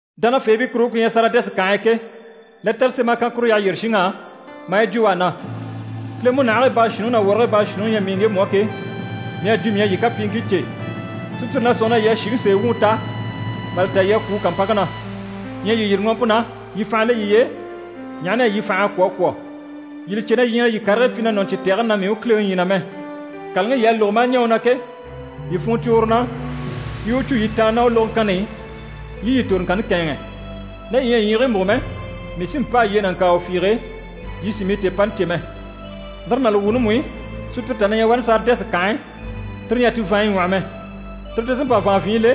Dánafeebii kuruŋke ku ɲyɛ Saridɛsi kànhe e ke, lɛtɛrɛ sém'a kan kuru yyaha yyére shinŋ'á maa yi jwo u á na: “Kile múnahigii baashuunniŋi ná wɔrigii baashuunniŋi ɲyɛ mii ŋgemu á ke, mii à jwo mii à yii kapyiiŋkii cè. Sùpyire na sɔ̂nŋi na yii à shìŋi sèe wuŋi ta, mà li ta yii à kwû u kàmpanŋke na. Ɲyɛ yii yîri ŋɔɔmpe na, yii fànha le yiye e, ɲaha na yɛ yii fành'à kwɔ̀ a kwɔ̀. Yii li cè na yii ɲyɛ na yii karigii pyi na nɔni cyi tɛgɛni na mii u Kileŋi ɲyii na mɛ. Kàlaŋi yii à lógo maa ɲɛɛ u na ke, yii funŋɔ cwo uru na, yii i u cû yii tàanna ná u lógoŋkanni i, yii i yii toroŋkanni kɛ̂ɛnŋɛ. Ná yii ɲyɛ a ɲyiigii múgo mɛ, mii sí n‑pâa yii e nàŋkaawa fiige, yii sì mii tèepani cè mɛ. Lire ná li wuuni mú i, sùpyire tà na ɲyɛ wani Saridɛsi kànhe e, tire ɲyɛ a ti vàanɲyi ɲwɔ́hɔ mɛ. Tire ti sí n‑pa vàanvyinɲyi le,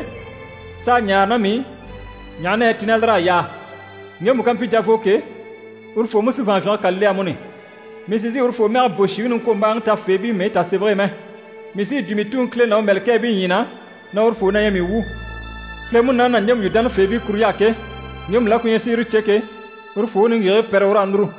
s'a ɲáare ná mii i, ɲaha na yɛ ti ná lir'à yaa. Ŋgemu ká mpyi javoo ke, urufoo mú sí vàanvyinge kà le amuni. Mii sì n‑sìi urufoo mɛge bò shìŋi niŋkwombaaŋi tafeebii mɛyi tasemɛge e mɛ. Mii sí yi jwo mii Tuŋi Kile ná u mɛ̀lɛkɛɛbii ɲyii na, na urufoo na ɲyɛ mii wu. Kile Munaani na ɲjemu yu dánafeebii kuruɲy'á ke, ŋgemu la ku ɲyɛ si yire cè ke, urufoo u niŋgyigigii pɛrɛ, u raa núru.”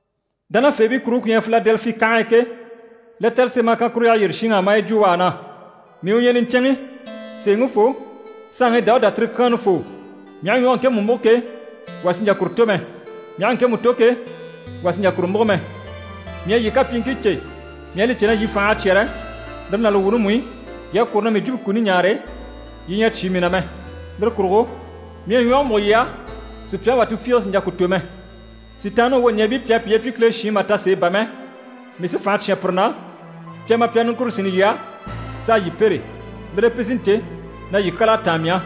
Dánafeebii kuruŋke ku ɲyɛ Filadɛlifi kànhe e ke, lɛtɛrɛ sém'a kan kuru yyaha yyére shinŋ'á, maa yi jwo u á na: “Mii u ɲyɛ niɲcɛnŋi, sèeŋifoo, saanŋi Dawuda tirikyaanni foo. Mii aha ɲwɔge ŋkemu múgo ke, wà sì n‑jà kuru tò mɛ, mii aha ŋkemu tò ke, wà sì n‑jà kuru múgo mɛ. Mii à yii kapyiiŋkii cè. Mii à li cè na yii fành'à cyɛ́rɛ, lire ná li wuuni mú i, yii à kwôro na mii jwumpe kuni ɲaare, yii ɲyɛ a cyé mii na mɛ. Lire kurugo, mii à ɲwɔge múgo yii á, sùpyaŋi wà tufiige sì n‑jà ku tò mɛ. Sitaanniŋi wwoɲɛɛbii pi à piye pyi Kile shiin mà ta sèe bà mɛ, mii sí fànha cyán pire na, pi a ma pi a niŋkure sínni yii á, s'a yii pêre. Lire e pi sí n‑cè na yii kyal'à táan mii á.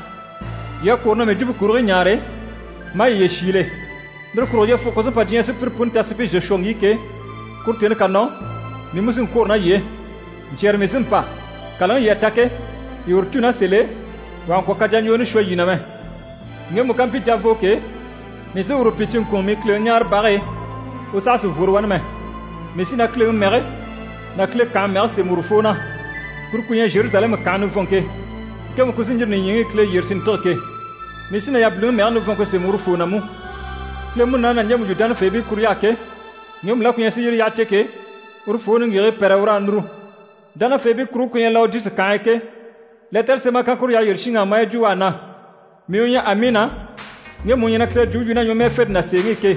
Yii à kwôro na mii jwumpe kurigii ɲaare, maa yiye shiile. Lire kurugo, yyefuge ku sí n‑pa diɲyɛŋi sùpyire puni ta si pi zò shwɔ ŋgíi ke, kuru tèni ká nɔ, mii mú sí n-kwôro ná yii e. Ɲcyɛ̀rɛ mii sí n‑pa. Kàlaŋi yii à ta ke, yii uru cû ná sèl'e, wà kà ŋkwɔ̀ kajaɲjwooni shwɔ yii na mɛ. Ŋgemu ká mpyi javoo ke, mii sí uru pyi cinŋkunŋɔ mii Kileŋi ɲáarebage e, u saha sì n‑fworo wani mɛ. Mii sí na Kileŋi mɛge ná Kile kànhe mɛge sémɛ urufoo na. Kuru ku ɲyɛ Zheruzalɛmu kànhe nivɔnŋke, ŋkemu ku sí n‑yîri nìɲyiŋi i Kile yyére si ntîge ke. Mii sí na yabiliŋi mɛge nivɔnŋke sémɛ urufoo na mú. Kile Munaani na ɲjemu yu dánafeebii kuruɲy'á ke, ŋgemu la ku ɲyɛ si yire yyaha cè ke, urufoo u niŋgyigigii pɛrɛ u raa núru.” Dánafeebii kuruŋke ku ɲyɛ Lawodisi kànhe e ke, lɛtɛrɛ sém'a kan kuru yyaha yyére shinŋ'á, maa yi jwo u à na: “Mii u ɲyɛ Amiina, ŋgemu u ɲyɛ na Kile jwumpe yu ná ɲwɔmɛɛfente ná sèeŋi i ke.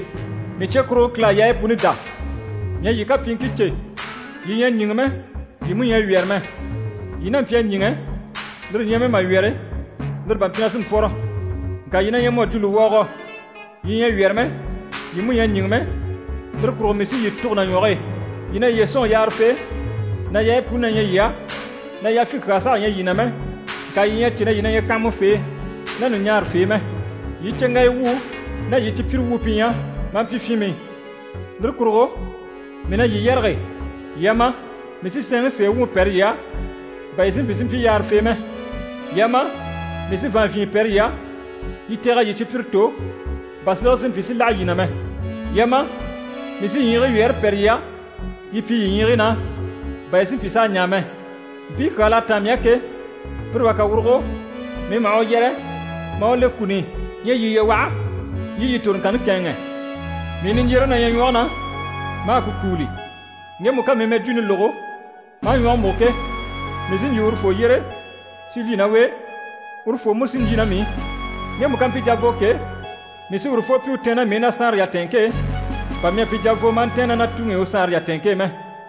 Mii cye kurugo Kile à yaayi puni dá. Mii à yii kapyiiŋkii cè. Yii ɲyɛ a ɲíŋɛ mɛ, yii mú ɲyɛ a wyɛ̀rɛ mɛ. Yii n'a mpyi a ɲíŋɛ, lire ɲyɛ mɛ mà wyɛ̀rɛ, lire bá mpyi na sí n‑pwɔ́rɔ. Ŋka yii na ɲyɛ mu à jwo lùwɔɔgɔ. Yii ɲyɛ a wyɛ̀rɛ mɛ, yii mú ɲyɛ a ɲíŋɛ mɛ, lire kurugo mii sí yii tûgo na ɲwɔge e. Yii na yiye sɔ̂nŋi yaarafee, na yaayi puni na ɲyɛ yii á, na yafyin kyaa saha ɲyɛ yii na mɛ, ŋka yii ɲyɛ a cè na yii na ɲyɛ kanhamafee ná ɲùɲaarafee mɛ. Yii cyeŋgaya wuu ná yii cipyire wuu pi ɲyɛ, maa mpyi fyinmii. Lire kurugo, mii na yii yɛrɛge: yii a ma, mii sí sɛɛnŋi sèe wuŋi pɛ́rɛ yii á, bà yii si mpyi si mpyi yaarafee mɛ. Yii a ma, mii sí vàanvyinɲyɛ pɛ́rɛ yii á, yii tɛ̀g'a yii cipyire tò, bà silege si mpyi si láha yii na mɛ. Yii a ma, mii sí ɲyiigii wyɛɛre pɛ́rɛ yii á, yii pyi yii ɲyiigii na, bà yii si mpyi s'a ɲaa mɛ. Mpii kyaa l'à táan mii á ke, pire wà ká wurugo, mii maha u yɛrɛ, maa u le kuni i. Ɲyɛ yii yiye waha, yii i yii toroŋkanni kɛ̂ɛnŋɛ. Mii niɲjyereŋi na ɲyɛ ɲwɔge na, maa ku kúuli. Ŋgemu ká mii mɛjwuuni lógo, maa ɲwɔge múgo ke, mii sí n‑jyè urufoo yyére si lyî ná u e, urufoo mú sí n‑lyî ná mii i. Ŋgemu ká mpyi javoo ke, mii sí urufoo pyi u tɛ̀ɛn ná mii i na saanre yatɛɛnŋke e, bà mii à pyi javoo maa ntɛ̀ɛn ná na Tuŋi i u saanre yatɛɛnŋke e mɛ.